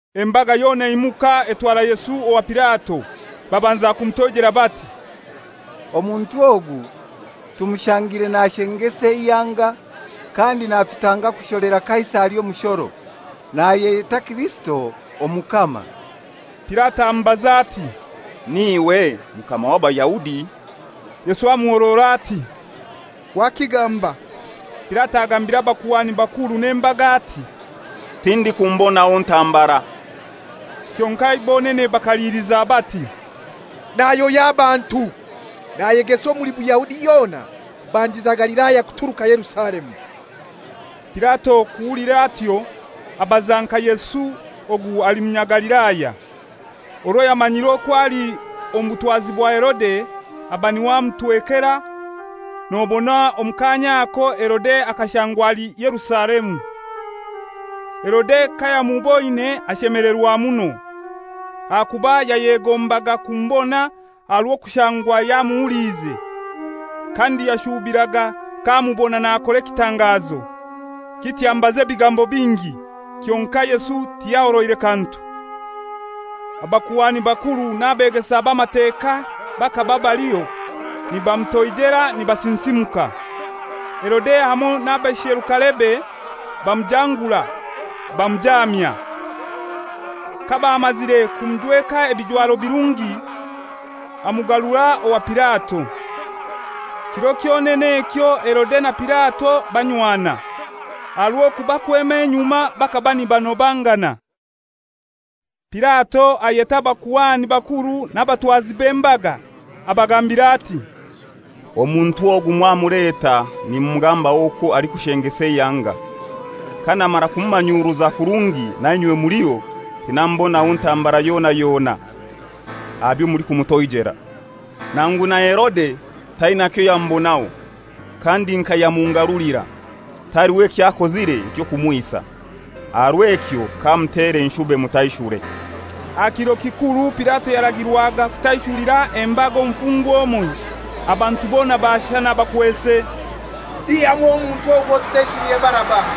Embaga yona eimuka etwara Yesu owa Pilato. Babanza kumutoijera bati, «Omuntu ogu tumushangire nashengesa eihanga, kandi natutanga kusholera Kaisari omushoro. Nayeyeta Kirisito Omukama.» Pilato amubaza ati, «N'iwe Mukama w'Abayahudi?» Yesu amuhorora ati, «Wakigamba.» Pilato agambira abakuhani bakuru n'embaga ati, «Tindikumubonaho ntambara.» Kyonkai bonene bakaliliza bati, «Nayohya abantu, nayegesa omuli Buyahudi yona, kubandiza Galilaya kuturuka Yerusalemu.» Pilato kuhulira atyo, abaza nka Yesu ogu ali Munyagalilaya. Orwo yamanyire okwo ali omu butwazi bwa Herode, aba n'iwe amutwekera, nobona omu kaanya ako Herode akashangwa ali Yerusalemu. Herode kayamuboine ashemelerwa muno, ahakuba yayegombaga kumubona aha rw'okushangwa yamuhuliize, kandi yashubiraga k'amubona nakora ekitangazo. Kityo amubaza ebigambo bingi, kyonkai Yesu tiyahoroire kantu. Abakuhani bakuru n'abeegesa b'Amateka bakaba baliho, nibamutoijera nibasinsimuka. Herode hamoi n'abaisherukarebe bamujangura, bamujamya. Kabamazire kumujweka ebijwaro birungi, amugarura owa Pilato. Kiro kyonene ekyo Herode na Pilato banywana, aha rw'okuba kwema enyuma bakaba nibanobangana. Pilato ayeta abakuhani bakuru n'abatwazi b'embaga, abagambira ati, «Omuntu ogu mwamuleta nimugamba okwo alikushengesa eihanga. Kanamara kumumanyuruza kurungi nainywe muliho, tinamubonaho ntambara yona yona aha byo mulikumutoijera. Nangu na Herode taina kyoyamubonaho; kandi nka yamungarulira! Taliho ky'akozire eky'okumwisa. Aha rw'ekyo kamutere, nshube mutaishure.» [Aha kiro kikuru Pilato yaragirwaga kutaishulira embaga omufungwa omoi.] Abantu bona baashana bakwese «Ihyamu omuntu ogwo, otutaishulire Baraba.»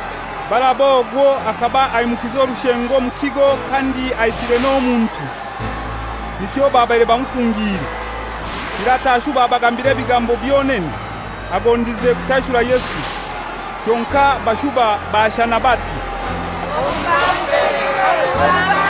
Baraba ogwo akaba aimukize orushengo omu kigo kandi aisire n'omuntu; nikyo babaire bamufungiire. Pilato ashuba abagambira ebigambo byonene, agondize kutaishura Yesu. Kyonkai bashuba baashana bati, «Omubambe! Omubambe!»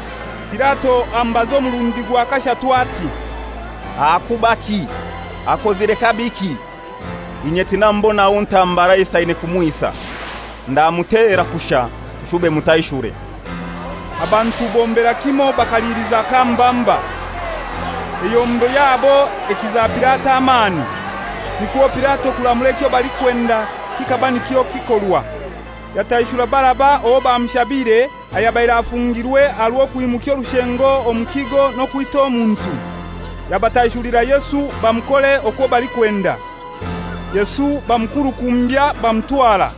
Pilato amubaza omurundi gwa kashatu ati, «Ahakubaki! Akozire kabiki? Inye tinamubonaho ntambara esaine kumwisa. Ndamutera kushai nshube mutaishure.» Abantu bombera kimoi bakaliliza k'amubamba. Eyombo yabo ekiza Pilato amani. Nikwo Pilato kuramura ekyo balikwenda kikaba nikyo kikorwa. Yataishura Baraba owo bamushabire, ayabaire afungirwe aha rw'okwimukya orushengo omu kigo n'okwita omuntu. Yabataishulira Yesu bamukore okwo balikwenda. Yesu bamukurukumbya bamutwara.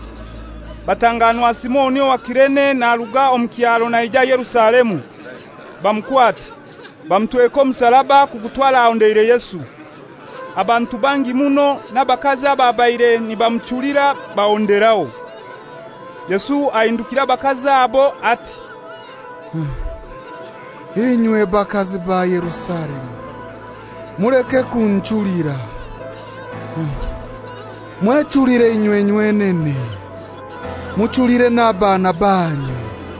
Batanganwa Simoni owa Kirene naruga omu kyaro naija Yerusalemu, bamukwata, bamutweka omusaraba kugutwara ahondeire Yesu. Abantu bangi muno, n'abakazi ababaire nibamuchulira bahonderaho. Yesu ahindukira abakazi abo ati, «Inywe bakazi ba Yerusalemu, muleke kunchulira. Mwechulire inywe nywenene, muchulire n'abaana banyu.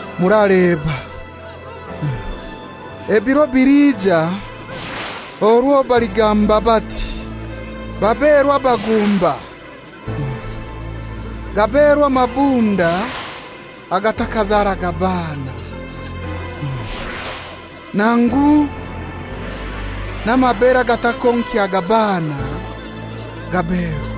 Muraleba, ebiro biliija orwo baligamba bati, ‹Baberwa abagumba, gaberwa amabere agatakazaraga baana, nangu amabunda gatakonkyaga baana gaberwa!›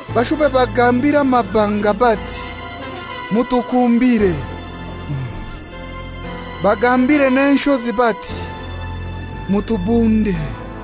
Bashube bagambire amabanga bati, ‹Mutukumbire;› bagambire n'enshozi bati, ‹Mutubunde.›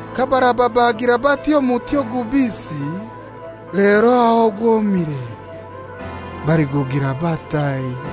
Kabaraba bagira bati omuti ogubisi, lero aho ogwomire baligugira batai?»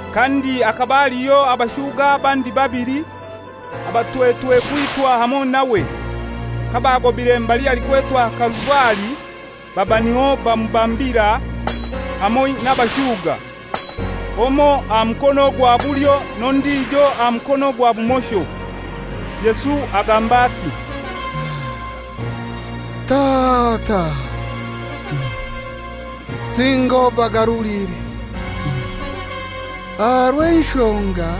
Kandi hakaba haliho abashuga abandi babili, abatwetwe kwitwa hamoi nawe. Kabagobire mbali halikwetwa Kaluvari, baba niho bamubambira, hamoi n'abashuga, omoi aha mukono gwa bulyo n'ondijo aha mukono gwa bumosho. Yesu agamba ati, «Tata, singa obagarulire; aha rw'enshonga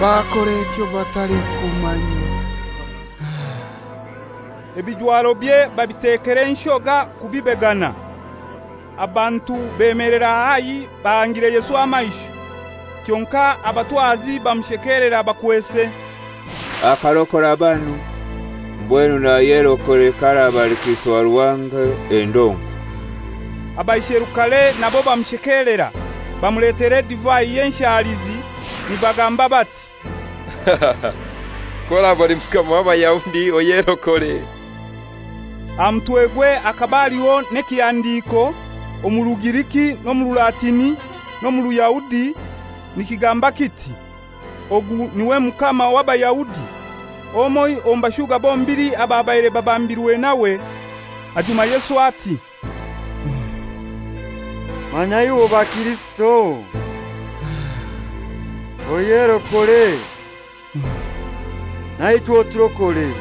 bakora ekyo batalikumanya.» Ebijwarobye babitekera enshoga kubibegana. Abantu bemelera haihi bahangire Yesu amaisho. Kyonkai abatwazi bamushekelera, bakwese, «Akarokora banu; mbwenu nayerokore k'araba ali Kirisito wa Ruhanga, endonkwa!» Abaisherukare nabo bamushekelera, bamuletera edivai y'enshalizi, nibagamba bati, «K'oraba oli Mukama w'Abayahudi oyerokore!» Aha mutwegwe hakaba haliho n'ekihandiiko omu Rugiriki n'omu Rulatini n'omu Ruyahudi, nikigamba kiti, «Ogu n'iwe Mukama w'Abayahudi.» Omoi omu bashuga bombili ababaire babambirwe nawe, ajuma Yesu ati, «Manya iwe oba Kirisito! Oyerokore naichwe oturokore!»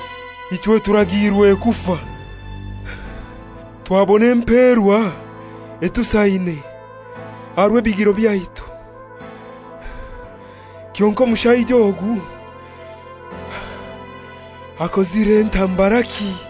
Ichwe turagiirwe kufa; twabona emperwa etusaine aha rw'ebigiro byaitu. Kyonkai omushaija ogu akozire ntambaraki?»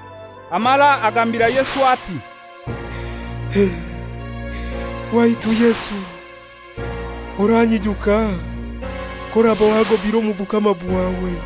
Amara agambira Yesu ati, «Waitu Yesu oranyijuka k'oraba wagobire omu bukama bwawe.»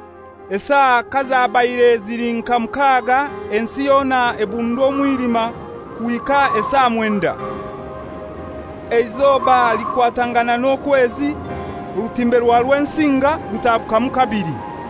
Esaa kazabaire zili nka mukaga, ensi yona ebundwa omwilima kuhika esaa mwenda. Eizoba likwatangana n'okwezi; orutimbe rwa Rwensinga rutaagukamu kabili.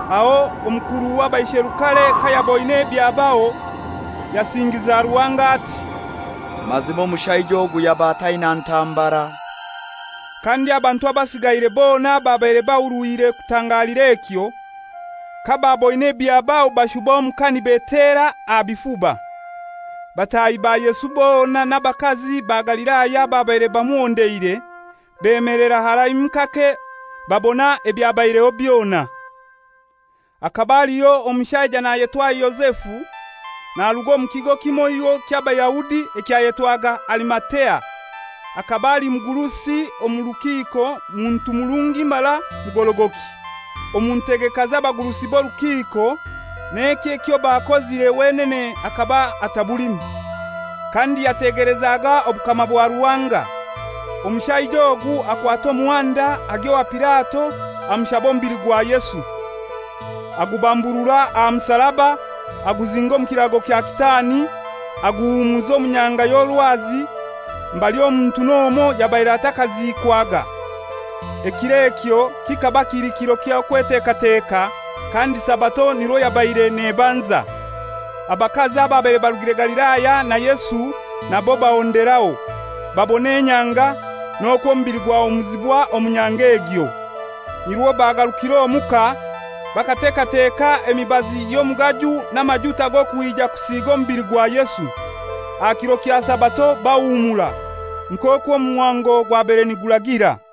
Aho omukuru w'abaisherukare kayaboine ebyabaho, yasingiza Ruhanga ati, «Mazima omushaija ogu yaba ataina ntambara.» Kandi abantu abasigaire bona ababaire bahurwire kutangalira ekyo, kabaaboine ebyabaho bashuba omuka nibeetera aha bifuba. Bataahi ba Yesu bona n'abakazi ba Galilaya ababaire bamuhondeire, bemelera haraimu kake, babona ebyabaireho byona. Akaba aliho omushaija nayetwa Yozefu, naruga omu kigo kimoiho ky'Abayahudi ekyayetwaga Arimatea. Akaba ali mugurusi omu rukiko, muntu murungi mara mugorogoki. Omu ntegeka z'abagurusi b'orukiko, n'eki ekyo bakozire, wenene akaba atabulimu. Kandi yategelezaga Obukama bwa Ruhanga. Omushaija ogu akwata omuhanda agya owa Pilato amushaba omubili gwa Yesu. Agubamburura aha musaraba, aguzinga omu kirago kya kitaani, aguhumuza omu nyanga y'orwazi, mbali omuntu n'omoi yabaire atakaziikwaga. Ekiro ekyo kikaba kili kiro ky'Okwetekateka, kandi Sabato nirwo yabaire nebanza. Abakazi ababaire barugire Galilaya na Yesu nabo bahonderaho, babona enyanga, n'okwo omubili gwahumuzibwa omu nyanga egyo. Nirwo bagarukire omuka, bakatekateka omugaju n'amajuta g'okwija kusiga omubili gwa Yesu. Aha kiro kya Sabato bahumura, nk'okwo omuhango gwabaire niguragira.